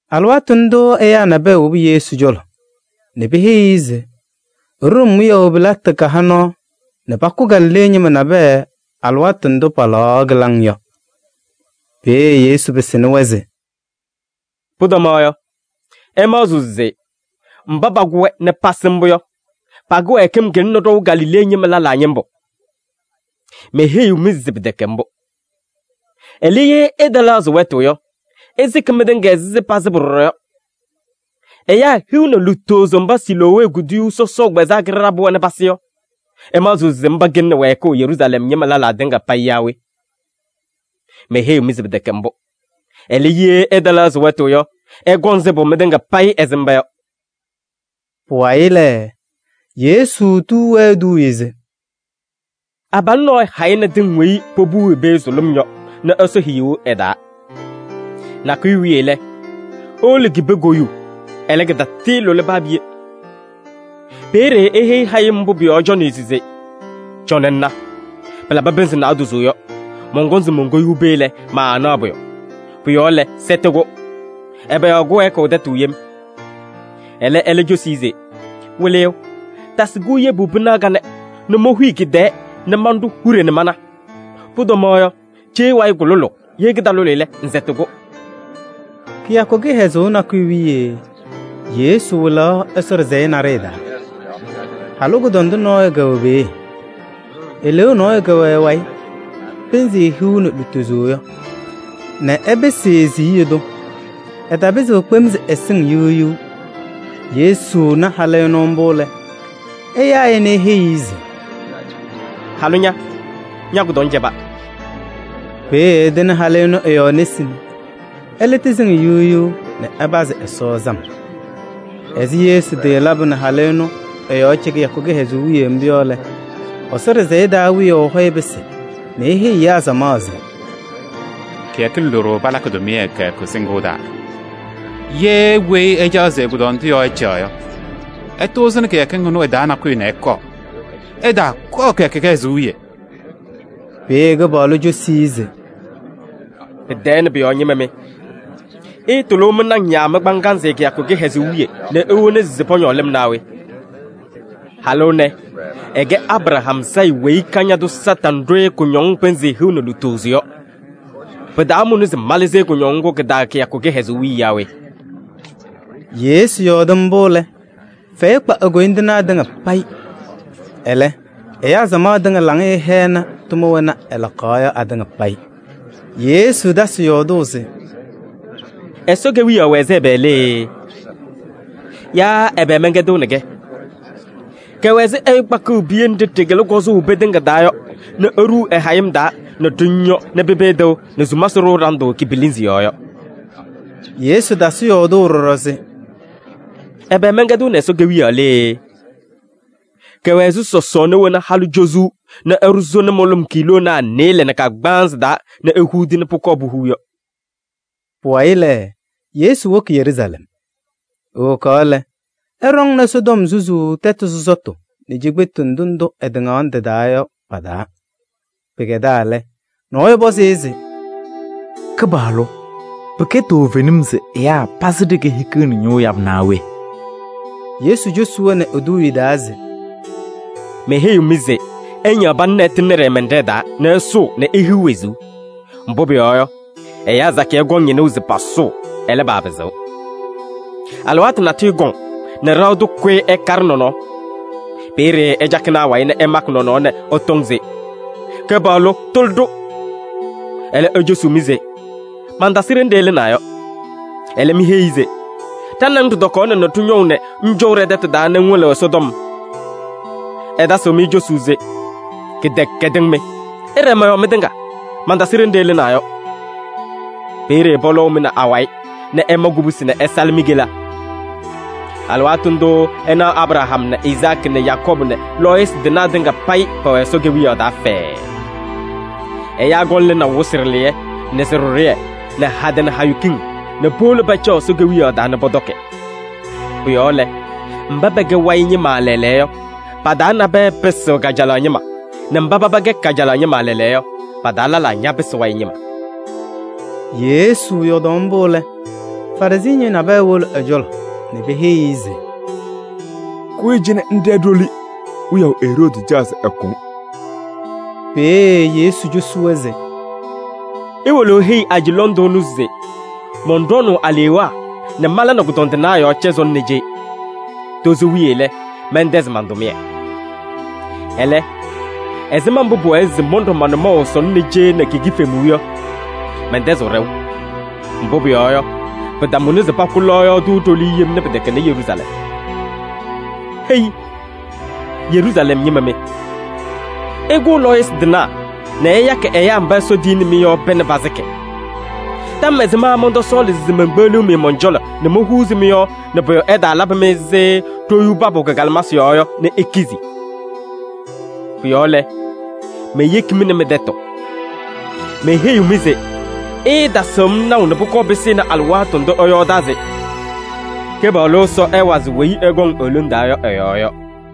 Alɩwaatʋ ndʋʋ ɛyaa nabɛyɛ wobi Yesu cɔlɔ nɛ peheyi-i se Room wiyaʋ Pilaatɩ kaha nɔɔ nɛ pakʋ Galilee ñɩma nabɛyɛ alɩwaatʋ ndʋ palaɣaɣ kɩlaŋ yɔ. Peeye Yesu pɩsɩnɩ-wɛ se: “Pʋtɔmaɣ yɔ, ɩmaɣzɩɣ se mba pakʋ-wɛ nɛ pasɩ mbʋ yɔ, pa-kɩwɛɛkɩm kɩlɩnɩ ɖɔʋ Galilee ñɩma lɛlaa ñɩmbʋ. Meheyiɣ-mɩ se pɩtɛkɛ mbʋ. Ɛlɛ, ye ɩtɛlɛɣzɩ wɛtʋ yɔ, ɩsɩkɩ mɩtɩŋa ɛzɩ pasɩbʋ ɖɔɖɔ yɔ. Ɛyaa hiu nɛ lutozo mba Siloowee kuduyuu sɔsɔʋ kpɛzaa kɩɖabɩ-wɛ nɛ pasɩ yɔ, ɩmaɣzɩɣ se mba kɩlɩnɩ wɛɛkʋʋ Yeruusalɛm ñɩma lɛlaa tɩŋa payɩ yaa we? Meheyiɣ-mɩ se pɩtɛkɛ mbʋ. Ɛlɛ, ye ɩtɛlɛɣzɩ wɛtʋ yɔ, ɩkɔŋ sɩbʋ mɩtɩŋa payɩ ɛzɩ mba yɔ.” Pʋwayɩ lɛ, Yesu tuu-wɛ eduuye se: “Abalʋ nɔɔyʋ hayɩnɩ tɩŋ weyi popuu i-pee sʋlʋm yɔ nɛ ɛsɔ hiyuu ɩ-taa. Nakʋyʋ wiye lɛ, ewolo ki-pee koyuu. Ɛlɛ, kɩtatɩɩlʋlɩ paa piye. Peeye eheyi hayɩm mbʋ pʋ-yɔɔ cɔnɩyʋ se: ‘Cɔnɩ ŋna, pɩlabɩ pɩnzɩ naadozo yɔ, mɔnkɔŋ se monkoyuu pee lɛ, maanaɣ pʋyʋ. Pʋ-yɔɔ lɛ, sɛtɩ-kʋ. Ɛbɛ yɔɔ kʋwɛɛkɩɣ tɛtʋ yem.’ Ɛlɛ, ɛlɛ cosi-i se: ‘Wɩlɩyʋ! Tasɩ-kʋ yebu pɩnaɣ kanɛ nɛ mohuyi kɩ-tɛɛ nɛ manɖʋ huɖe nɛ mana. Pʋtɔmaɣ yɔ, cee wayɩ kʋlʋlʋʋ. Ye kɩtalʋlɩ lɛ, ŋsɛtɩ-kʋ.’” Kɩyakʋ kɩhɛzʋʋ nakʋyʋ wiye Yesu wɩlaɣ Ɛsɔ ɖɩsɛyɛ naɖɩyɛ taa. Halʋ kʋdɔndʋ nɔɔyʋ kɛwɛ peeye. Eleeu nɔɔyʋ kɛwɛ ɛ-wayɩ pɩnzɩ hiu nɛ lutozo yɔ nɛ ɛpɩsɩ-ɩ siɣye tʋ. Ɛtaapɩzɩɣ kpem se ɛsɩŋ yiɣ yiɣ. Yesu na halʋ ɛnʋ mbʋ lɛ, ɛyaa-ɩ nɛ eheyi-i se: “Halʋ ña! Ña-kʋdɔŋ cɛba.” Peeye ɛtɩnɩ halʋ ɛnʋ ɛ-yɔɔ nesi nɛ ɛlɛ tɩsɩŋ yiɣ yiɣ nɛ ɛpazɩ Ɛsɔ sam. Ɛzɩ Yesu tɩɩlabʋ nɛ halʋ ɛnʋ ɛ-yɔɔ cɛ kɩyakʋ kɩhɛzʋʋ wiye mbʋ yɔ lɛ, Ɛsɔ ɖɩsɛyɛ taa wiyaʋ hɔyɛ pɩsɩ nɛ eheyi ɛyaa samaɣ se: “Kɩyakɩŋ loɖo palakɩ tʋmɩyɛ kɩyakʋ kɩsɩŋʋʋ taa. Ye weyi ɛcaɣ se ɛ-kʋdɔndʋ yɔɔ ɛcɛ yɔ, ɛtʋʋzɩnɩ kɩyakɩŋ ɩnʋ ɩ-taa nakʋyʋ nɛ ɛkɔɔ. Ɛtaakɔɔ kɩyakʋ kɩhɛzʋʋ wiye.” Peeye Kɩpaɣlʋ cosi-i se: “Tɛɛ nɛ pʋ-yɔɔ ñɩma mɩ! Ɩɩtʋlʋʋ mɩ-naŋ yaa mɩ-kpaŋasɩ kɩyakʋ kɩhɛzʋʋ wiye nɛ iwona se pɔñɔɔ lɩm naa we? Halʋ ɛnɛ, ɛkɛ Abraham sayɩ weyi Kañadʋ Satanɩ ɖʋ-ɩ kʋñɔŋ pɩnzɩ hiu nɛ lutozo yɔ. Pɩtaamʋnɩ se malɩzɩ-ɩ kʋñɔŋ ŋgʋ kɩ-taa kɩyakʋ kɩhɛzʋʋ wiye yaa we?” Yesu yɔɔdɩ mbʋ lɛ, fɛyɛ kpa e-koyindinaa tɩŋa payɩ. Ɛlɛ, ɛyaa samaɣ tɩŋa laŋɩyɛ hɛnɩ tʋma wena ɛlakaɣ yɔ atɩŋa payɩ. Yesu tasɩ yɔɔdʋʋ se: “Ɛsɔ Kewiyaɣ wɛ ɛzɩ ɛbɛ lee? Yaa ɛbɛ mɛnkɛdɩɣnɩ-kɛ? Kɛwɛ ɛzɩ ɛyʋ kpakʋʋ piye nɖɩ ɖɩkɩlɩ kɔzʋʋ pee tɩŋa taa yɔ nɛ eɖuu ɛ-hayɩm taa nɛ ɖɩñɔ nɛ pɩpɩɩ tɩʋ nɛ sumasɩ ɖʋʋ ɖandʋ ki-pilinzi yɔɔ yɔ.” Yesu tasɩ yɔɔdʋʋ ɖɔɖɔ se: “Ɛbɛ mɛnkɛdɩɣnɩ Ɛsɔ Kewiyaɣ lee? Kɛwɛ ɛzɩ sɔsɔɔna wena halʋ cozuu nɛ ɛɖʋ sona mʋlʋm kiiloonaa nɩɩlɛ nɛ kagbaanzɩ taa nɛ ehuudi nɛ pʋkɔɔ puhuu yɔ.” Pʋwayɩ lɛ, Yesu woki Yeruusalɛm. Ewokaɣ lɛ, ɛɖɔŋnɩ Ɛsɔtɔm susuu tɛtʋ sɔsɔtʋ nɛ cikpetu ndʋ ndʋ ɛtɩŋaɣnɩ tɩ-taa yɔ pa-taa. Pɩkɛdaa lɛ, nɔɔyʋ pɔzɩ-ɩ se: “Kɩpaɣlʋ! Pɩkɛ toovenim se ɛyaa pazɩ ɖeke hikiɣni ñʋʋ yabʋ naa we?” Yesu cosi-wɛ nɛ eduuye taa se: “Meheyiɣ-mɩ se: ɩñaɣ pana nɛ ɩtɩŋnɩ ɖɛɛmɛnɖɛɛ taa nɛ ɩsʋʋ nɛ ihiɣ wezuu. Mbʋ pʋyɔɔ yɔ, ɛyaa sakɩyɛ kɔŋ ñɩnʋʋ se pasʋʋ, ɛlɛ, paapɩzɩɣ. Alɩwaatʋ natʋyʋ kɔŋ nɛ ɖɩɣa tʋ kʋyɩ ɛkaɖɩ nɔnɔɔ. Peeye ɩcakɩnɩ awayɩ nɛ ɩmakɩ nɔnɔɔ nɛ ɩtɔŋ se: ‘Kɩpaɣlʋ! Tʋlɩ-ɖʋ!’ Ɛlɛ, ecosuu-mɩ se: ‘Mantasɩ ɖenɖe ɩlɩnaa yɔ.’ Ɛlɛ, miheyi-i se: ‘Ɖa nɛ ŋ ɖɩtɔkaɣna nɛ ɖɩñɔʋ nɛ ŋcɔʋ ɖɛ-tɛtʋ taa nɛ ŋwɩlɩɣ Ɛsɔtɔm.’ Ɛtasɩɣ-mɩ cosuu se: ‘Kɩdɛkɛdɩŋ mɩ! Ɩɖɛɛ mɔ-yɔɔ mɩtɩŋa. Mantasɩ ɖenɖe ɩlɩnaa yɔ.’ Peeye pɔlɔʋ-mɩ nɛ awayɩ nɛ ɩma kubusi nɛ ɩsalɩ mi-kela. Alɩwaatʋ ndʋʋ ɩnaɣ Abraham nɛ Izaakɩ nɛ Yakɔɔbʋ nɛ lɔɔyɩsɩ tɩnaa tɩŋa payɩ pɛwɛ Ɛsɔ Kewiyaɣ taa fɛɛɛ. Ɛyaa kɔŋ lɩnaʋ wɩsɩ ɖɩlɩyɛ nɛ sɩ-ɖɩɖʋyɛ nɛ hadɛ nɛ hayo kiŋ nɛ powolo pacaɣ Ɛsɔ Kewiyaɣ taa nɛ pɔtɔkɩ. Pʋ-yɔɔ lɛ, mba pɛkɛ wayɩ ñɩma lɛɛlɛɛyɔ yɔ, pa-taa nabɛyɛ pɩsɩɣ kajalaɣ ñɩma nɛ mba paba kɛ kajalaɣ ñɩma lɛɛlɛɛyɔ yɔ, pa-taa lɛlaa ñapɩsɩ wayɩ ñɩma.” Yesu yɔɔdaɣ mbʋ lɛ, Farɩsɩ ñɩma nabɛyɛ wolo ɛ-cɔlɔ nɛ peheyi-i se: “Kʋyɩ cɩnɛ nɛ ŋɖɛɛ ɖoli. Wiyaʋ Eroodi caɣ se ɛkʋ-ŋ.” Peeye Yesu cosi-wɛ se: “Iwolo iheyi aji lɔŋ tʋ ɛnʋ se mɔnɖɔɔnʋʋ alewaa nɛ mala nɛ kʋdɔndɩnaa yɔɔ cɛ sɔnɔ nɛ cee. Tozo wiye lɛ, mɛntɛzɩ man-tʋmɩyɛ. Ɛlɛ, ɛzɩma mbʋ pʋwɛɛ se mɔnɖɔ ma-nʋmɔʋ sɔnɔ nɛ cee nɛ ki-kifemuu yɔ, mɛntɛzɩɣ ɖɛʋ. Mbʋ pʋyɔɔ yɔ, pɩtamʋnɩ se pakʋ lɔɔyaɣ tʋ ɖoli yem nɛ pɩtɛkɛnɩ Yeruusalɛm. Hei! Yeruusalɛm ñɩma mɩ, ɩkʋʋ lɔɔyɩsɩ tɩnaa nɛ ɩyakɩ ɛyaa mba Ɛsɔ tiyini-mɩ yɔ pɛɛ nɛ pasɩkɩ. Tɔm ɛzɩma mɔntɔsɔɔlɩ se menkpeɣli-mɩ mɔn-cɔlɔ nɛ mohuuzi mɩ-yɔɔ nɛ pʋyʋ ɛtaalabɩ-mɩ ɛzɩ ɖoyuu pabʋʋ kɩ-kalɩmasɩ yɔɔ yɔ nɛ ikizi? Pʋ-yɔɔ lɛ, meyeki-mɩ nɛ mɩ-tɛtʋ. Meheyiɣ-mɩ se: ɩɩtasɩɣ-m naʋ nɛ pʋkɔɔ pɩsɩnɩ alɩwaatʋ ndʋ ɩyɔɔdaa se: ‘Kɩpaɣlʋ Ɛsɔ ɛwazɩ weyi ɛkɔŋ e-lone taa yɔ ɛ-yɔɔ yɔ.’”